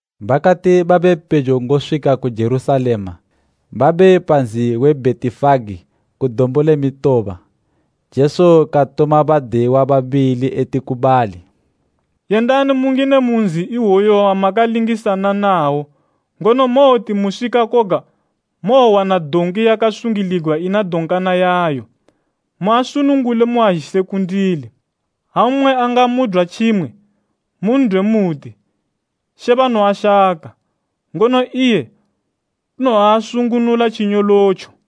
Bakati babepejo ngoswika ku Jerusalema, babe pa nzi we Bhetifage ku Dombo le Mitoba, Jesu katuma badiyiwa babili eti ku bali “Yendani mungine mu nzi iwoyu wamakalingisana nawo, ngono mowoti muswika koga mowowana donki yakasungiligwa ina donkana yayo. Muasunungule muazhise kundili. Ha mmwe angamudwa tjimwe, mun'dwe muti, ‘She banoashaka,’ ngono iye unowoasunungula tjinyolotjo.”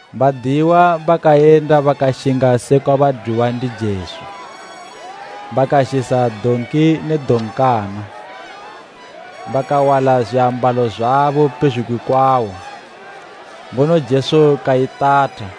Badiyiwa bakayenda bakashinga sekwa badwiwa ndi Jesu. Bakazhisa donki ne donkana, bakawala zwiambalo zwabo pezhugwi kwawo, ngono Jesu kaitatha.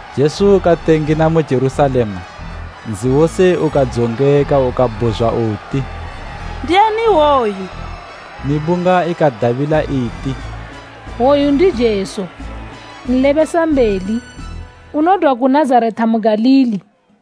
Jesu kati engina mu Jerusalema, nzi wose ukadzongeka ukabhuzwa uti, “Ndiani iwoyu?” Mibunga ikadabila iti, “Oyu ndi Jesu, nlebesambeli, unodwa ku Nazareta mu Galili.”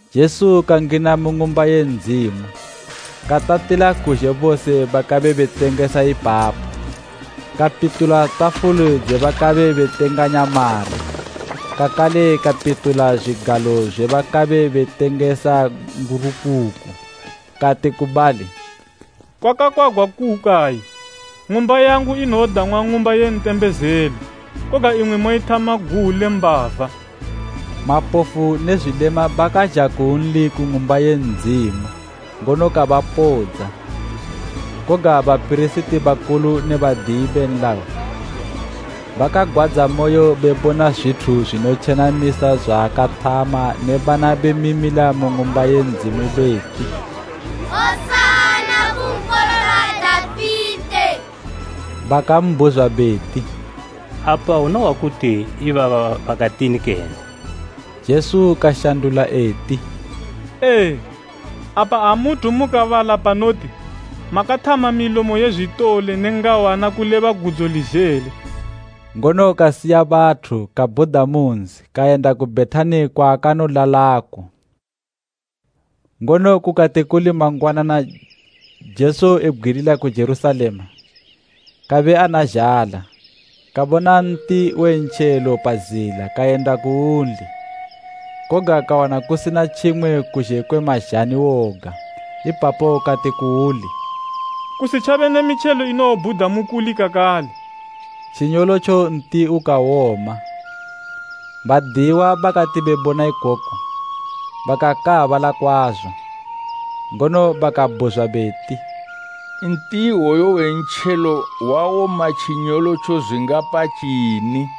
Jesu kangina mu Ng'umba ye Ndzimu katatila kuzhe bose bakabe betengesa ipapo. Kapitula tafuli dze bakabe betenganya mari, kakale kapitula zwigalo zwe bakabe betengesa ngurukuku. Kati ku bali, “Kwakakwagwa kukayi, ‘Ng'umba yangu inowodang'wa ng'umba ye ntembezelo,’ koga imwi moithama guwu le mbava!” Mapofu ne zwilema bakazha kunli ku Ng'umba ye Ndzimu, ngono kabapodza. Koga bapirisiti bakulu ne badiyi be nlayo bakagwadza moyo bebona zwithu zwinotjenamisa zwaakathama ne bana bemimila mu Ng'umba ye Ndzimu beti, “Hosana ku Nkololo wa Dafite.” Bakambhuzwa beti, “Apa unohwa kuti bana ibaba bakatini kene?” Jesu kashandula eti, “Ee, apa amuthu mukabala panoti, ‘Makathama milomo ye zwitole ne ngawana kuleba gudzo le zhele.’” Ngono kasiya bathu kabhuda mu nzi kayenda ku Bhetani kwaakanolalako. Ngono kukati kuli mangwanana Jesu, ebgwilila ku Jerusalema, kabe ana zhala, kabona nti we mpaya pa zila kayenda kuuli koga kawana kusina tjimwe kuzhe kwe mazhani woga. Ipapo kati kuuli, “Kusitjabe ne mitjelo inowobhuda mukuli kakale.” Tjinyolotjo nti ukawoma. Badiyiwa bakati bebona ikoku bakakaabala kwazo. Ngono bakabhuzwa beti, “Nti iwoyo we mpaya wawoma tjinyolotjo zwingapa tjini?”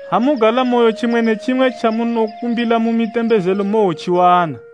Ha mugalamoyo tjimwe ne tjimwe tjamunokumbila mu mitembezelo mowotjiwana.”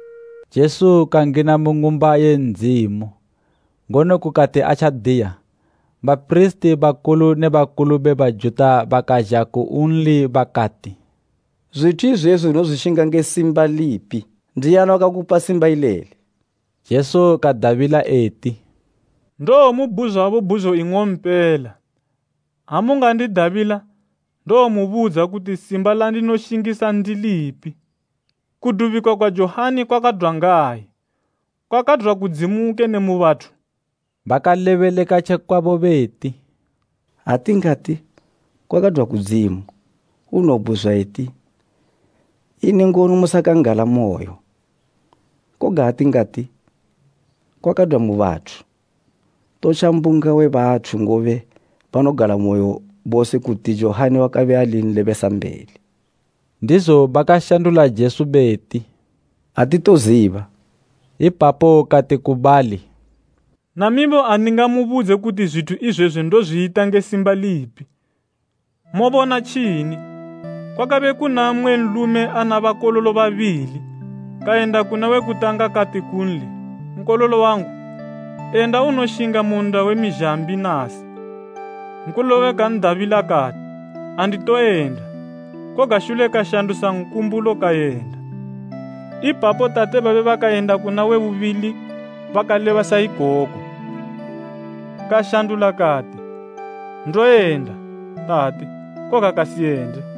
Jesu kangina mu Ng'umba ye Ndzimu, ngono kukati atjadiya, bapirisiti bakulu ne bakulu be Bajuta bakazha kunli bakati, “Zwithu izwezwi unozwishinga nge simba lipi? Ndiani wakakupa simba ileli?” Jesu kadabila eti, “Ndowomubhuzwabo bhuzo ing'ompela. Ha mungandidabila, ndowomubudza kuti simba landinoshingisa ndilipi. Kudubika kwa Johani kwakadwa ngayi? Kwakadwa kudzimu kene mu bathu?” Bakalebeleka tje kwabo beti, “Ha tingati, ‘Kwakadwa kudzimu,’ unowobhuzwa eti, ‘Ini ngono musakan'galamoyo?’ Koga ha tingati, ‘Kwakadwa mu bathu,’ totja mbunga we bathu, ngobe banogalamoyo bose kuti Johani wakabe ali nlebesambeli.” Ndizo bakashandula Jesu beti, “Atitoziba.” Ipapo kati ku bali, “Namibo andingamubudze kuti zwithu izwezwi ndozwiyita nge simba lipi. “Mobona tjini? Kwakabe kuna mmwe nlume ana bakololo babili. Kayenda kuna we kutanga kati kunli, ‘Nkololo wangu, en'da unoshinga mu nnda we mizhambi nasi.’ Nkololo uwe kan'dabila kati, ‘Anditoyenda.’ Koga shule kashandusa nkumbulo kayenda. Ipapo tate babe bakayenda kuna we bubili bakaleba sa ikoko. Kashandula kati, ‘Ndowoyenda, tate,’ koga kasiyende.”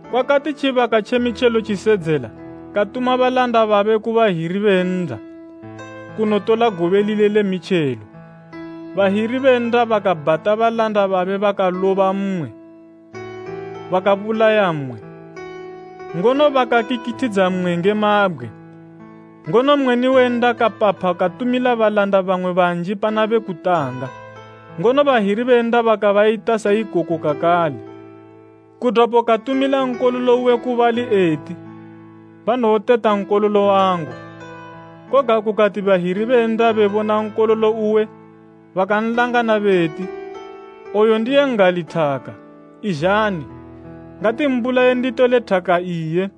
Kwakati tjibaka tje mitjelo tjisedzela katuma balanda babe ku bahiri be nnda kunotola gobe lile le mitjelo. Bahiri be nnda bakabhata balanda babe bakaloba mmwe, bakabulaya mmwe, ngono bakakikithidza mmwe nge mabgwe. Ngono mweni we nnda kapapha katumila balanda bamwe banji pana be kutanga, ngono bahiri be nnda bakabayita sa ikoko kakale. Kudwapo katumila nkololo uwe ku bali eti, ‘Banowoteta nkololo wangu.’ Koga kukati bahiri be nnda bebona nkololo uwe bakan'langana beti, ‘Oyu ndiye n'gali thaka, izhani, ngatimbulayeni titole thaka iye.’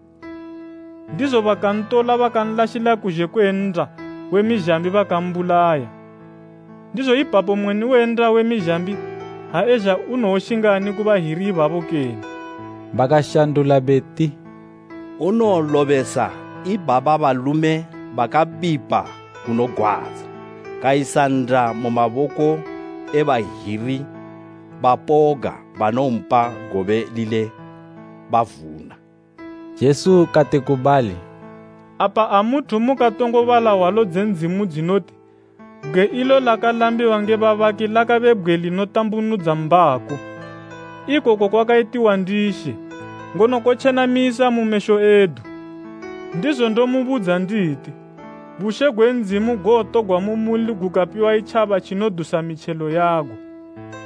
Ndizo bakantola bakanlashila kuzhe kwe nnda we mizhambi bakambulaya. “Ndizo ipapo mweni we nnda we mizhambi ha ezha unowoshingani ku bahiri ibabo kene?” Bakashandula beti, “Unowolobesa ibaba balume bakabipa kunogwadza, kayisa nnda mu maboko e bahiri bapoga banowompa gobe lile bavuna.” Jesu kati ku bali, “Apa amuthu mukatongo bala hwalo dze Ndzimu dzinoti, “ ‘Bgwe ilo lakalambiwa nge babaki lakabe bgwe linotambunudza mbako; ikoku kwakayitiwa ndi She, ngono kotjenamisa mu mesho edu?’ “Ndizo ndomubudza nditi, bushe gwe Ndzimu gowotogwa mu muli gokapiwa itjaba tjinodusa mitjelo yago.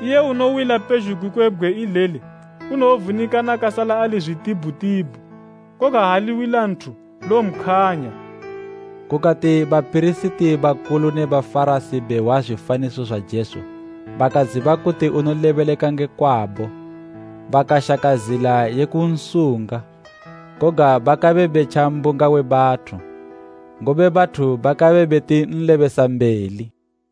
Iye unowila pezhugwi kwe bgwe ileli unowovunikana kasala ali zwitibhutibhu, koga ha liwila nthu lowompkhwanya.” Kukati bapirisiti bakulu ne Bafarasi behwa zwifaniso zwa Jesu bakaziba kuti unolebeleka nge kwabo. Bakashaka zila ye kunsunga, koga bakabe betja mbunga we bathu, ngobe bathu bakabe beti nlebesambeli.